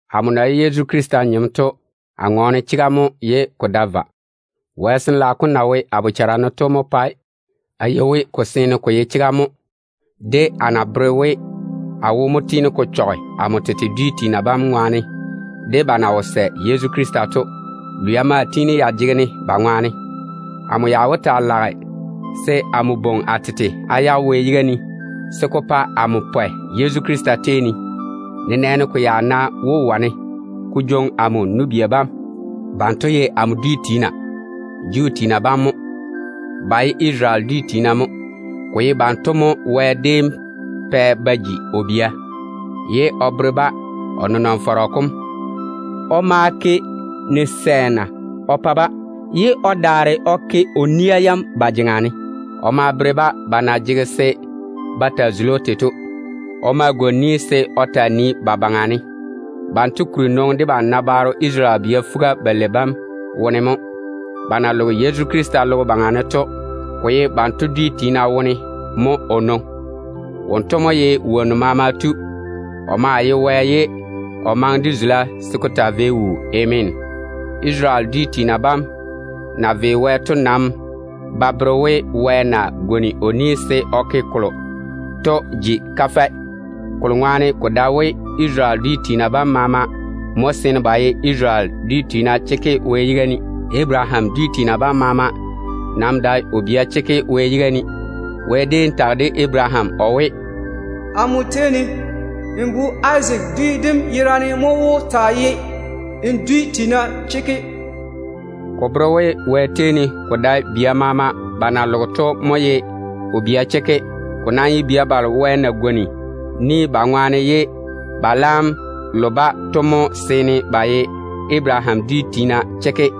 Amo na ye Yezu Krista nyem to, a ŋɔɔne chega mo ye ko dae vwa. Wɛ Sin-laao kom na wo a bochare ne to mo pae a yɔɔre a yei we, a wo mo tiini ko chɔge amo tete dwi tiina bam ŋwaane de ba na wo sɛ Yezu Krista to. Lwia maa tiini ya jege-ne ba ŋwaane. Amo ya wó taa lage se a le a tete Wɛ yiga ne a yage se ko pa amo pwɛ Yezu Krista tei ne, nenɛɛne ko ya ná wó wane ko woli amo nu-bia bam. Banto ye amo tete dwi tiina. Ba ye Isarele dwi tiina mo. Ko ye banto mo Wɛ déem pɛ ba ji o bia, ye o bere-ba o nenɔŋ-fɔrɔ kom. O ma gwoni ni o pa-ba, ye o daare o ke o nia yam ba jeŋa ne. O ma bere-ba ba na jege se ba taa zuli‑o tei to. O ma pwooli se o taa nii ba baŋa ne. Ba kuri nwoŋi debam nabaaro Isarele bia fuga-balei bam wone mo. Ba na loge Yezu Krista logo baŋa ne to, ko ye banto dwi tiina wone mo o nwoŋi. Wonto mo ye wonnu maama Tu Wɛ wom na maŋe se o taa jwoŋi teem taa wuu to. Ameena. Isarele dwi tiina bam na ve Wɛ to nam ba bere we Wɛ na gwoni o ni se o ke kolo to jigi kafɛ. Kokuri to, ko dae we Isarele dwi tiina bam maama mo seene ba ye Isarele tiina chekke Wɛ yiga ne. Abaraham dwi tiina bam maama nam dae o bia chekke Wɛ yiga ne. Wɛ déem tage de Abaraham o we, “Amo tei ne, n bu Izaak dwi dem yerane mo wó taa ye n dwi tiina chekke.” Ko bere we, ko dae bia balo maama ba na loge to mo ye Wɛ bia chekke. Ko nam ye bia balo Wɛ na pwooli kampwola kam ba ŋwaane ye ba laam lo-ba to mo seene ba ye Abaraham dwi tiina chekke.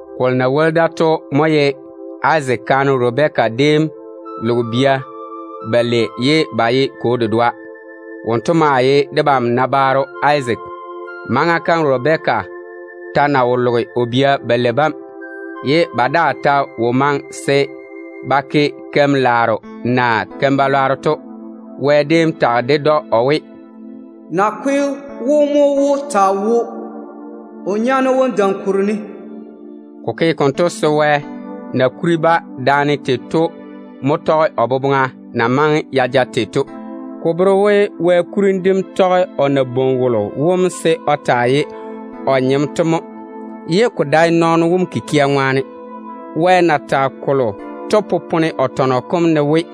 Kolo na woli da to mo ye Izaak kaane Rabɛka déem loge bia balei ye ba ye kwo dedoa. Wonto maa ye debam nabaaro Izaak. Maŋa kam Rabɛka ta na wo loge o bia balei bam, ye ba daa ta wo maŋe se ba ke keim-laaro naa keim-balwaaro to, Wɛ déem tage ded‑o o we, “Zembaaro wom mo wó taa toŋe o pa o nyaane wom.” Ko ke konto se Wɛ na kuri-ba daane tei to mo tɔge o boboŋa na maŋe ya ja tei to. Ko bere we Wɛ kurim dem tɔge o na bwoŋi wolo wom se o taa ye o nyem to mo, ye ko dae nɔɔno wom kikia ŋwaane. Wɛ na tage kolo to popone o tɔnɔ kom ne we,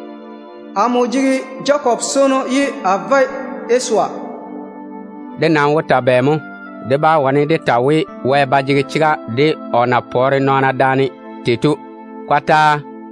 “Amo jege Jakob swono, ye a chuli Esawu ni taane.” Dé nam wó ta bɛ mo? Dé bá wane dé ta we Wɛ ba jege chega de o na pɔɔre nɔɔna daane tei to. Kɔtaa!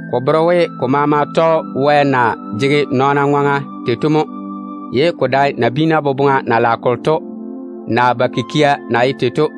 Ko bere we ko maama tɔge Wɛ na jege nɔɔna ŋwaŋa tei to mo, ye ko dae nabiina boboŋa na lage kolo to, naa ba kikia na ye tei to.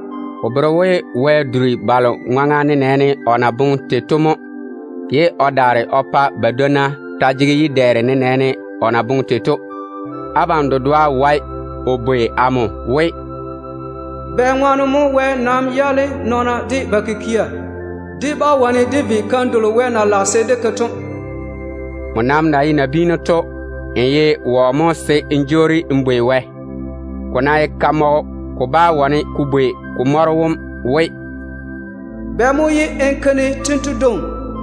Ko bere we Wɛ duri balo ŋwaŋa nenɛɛne o na boŋe tei to mo, ye o daare o pa badwonna taa jege yi-dɛɛre nenɛɛne o na boŋe tei to. Abam dedoa wae o bwei amo we, “Bɛŋwaane mo Wɛ nam yaale nɔɔna de ba kikia? Dé bá wane dé ve keim delo Wɛ na jaane boboŋa se dé ke to.” Nmo nam na ye nabiinu to, n ye wɔ mo se n jwoori n bwei Wɛ? Ko ná ye kamɔgɔ, ko bá wane ko bwei ko mɔro wom we, “Bɛ mo ye n ke-ne tento dwoŋi?”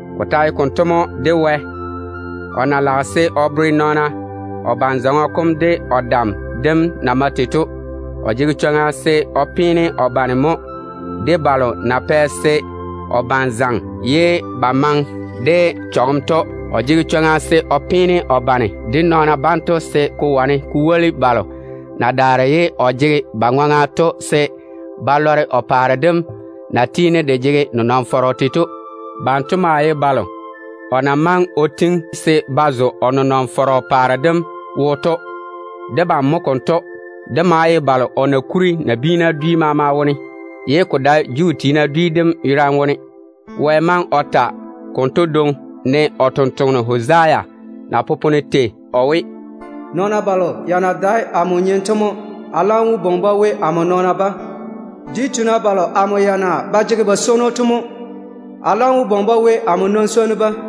Ko ta ye konto mo de Wɛ. O ná lage se o bere nɔɔna o ban-zɔŋɔ kom de o dam dem na mae tei to, o jege chwoŋa se o peene o bane mo de balo na chuchugi o bane ye ba maŋe de chɔgem to. O jege chwoŋa se o peene o bane konto dwoŋi se ko wane ko woli balo na daare ye o jege ba ŋwaŋa to, se ba lɔre o paare dem na tiini de jege nenɔŋ-fɔrɔ tei to. Banto maa ye balo o na maŋe o tiŋi se ba zo o paare dem wo to. Debam mo konto. Dé maa ye balo o na kuri nabiina dwi maama wone, ye ko dae Juu tiina dwi dem yerane wone to. Wɛ maŋe o tɔge Hosea baŋa ne o we: “Nɔɔna balo ya na dae amo nyem to mo a laam wó bwoŋi-ba we, amo nɔɔna bam. Dwi tiina balo amo ya na ba jege ba swono to mo a laam wó bwoŋi-ba we, amo nɔn-swonnu tem.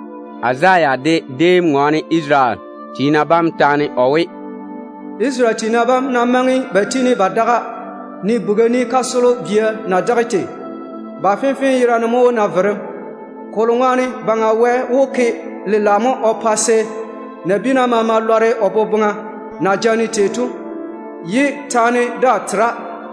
Izaya de déem ŋɔɔne Isarele tiina bam taane o we: “Isarele tiina bam ná maŋe ba daga, ne naneo ni kasolo bia na ye tei, ba fenfee yerane mo wó na verem. Kolo ŋwaane Baŋa Wɛ wó ke lela mo o pa se nabiina maama lɔre o boboŋa na jaane se o waare-ba tei to ye taane daa tera.”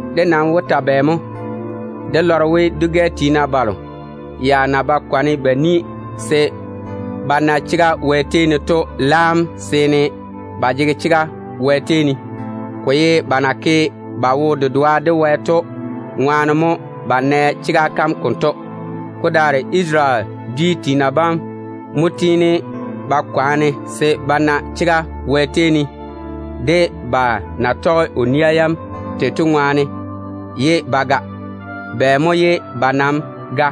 Dé nam wó ta bɛ mo? Dé lɔre we dwi-gɛ tiina balo ya na ba kwaane ba nii se ba na chega Wɛ tei ne to laam seene ba jege chega Wɛ tei ne. Ko ye ba na ke ba wo-dedoa de Wɛ to ŋwaane mo ba nɛ chega kam konto. Ko daare Isarele dwi tiina bam mo tiini ba kwaane se ba na chega Wɛ tei ne de ba na tɔge o nia yam tei to ye ba ga. Bɛ mo ye ba nam ga?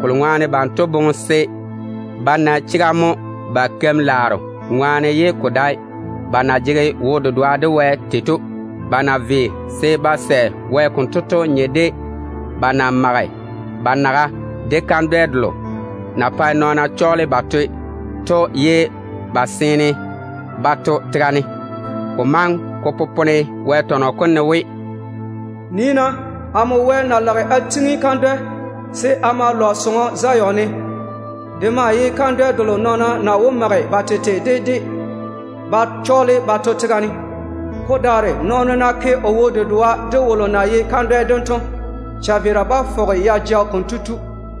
Kolo ŋwaane banto boŋe se ba na chega mo ba keim-laaro ŋwaane ye ko dae ba na jege wo-dedoa de Wɛ tei to. Ba na ve Wɛ konto to nye de ba mage ba naga de kandwɛ delo na pae nɔɔna chɔɔle ba toe to ye ba seene ba to tega ne. Ko maŋe ko popone Wɛ tɔnɔ kom ne we: “Nii-na! Amo lage a chwi kandwɛ mo Zion ne. De maa ye pelɔrɔ kolo na cheili pa nɔɔna gare-ko ba to tega ne to mo. Ko daare nɔɔno ná ke o wo-dedoa de wolo na ye kandwɛ dem to, chaveera bá fɔge ya ja kotu.”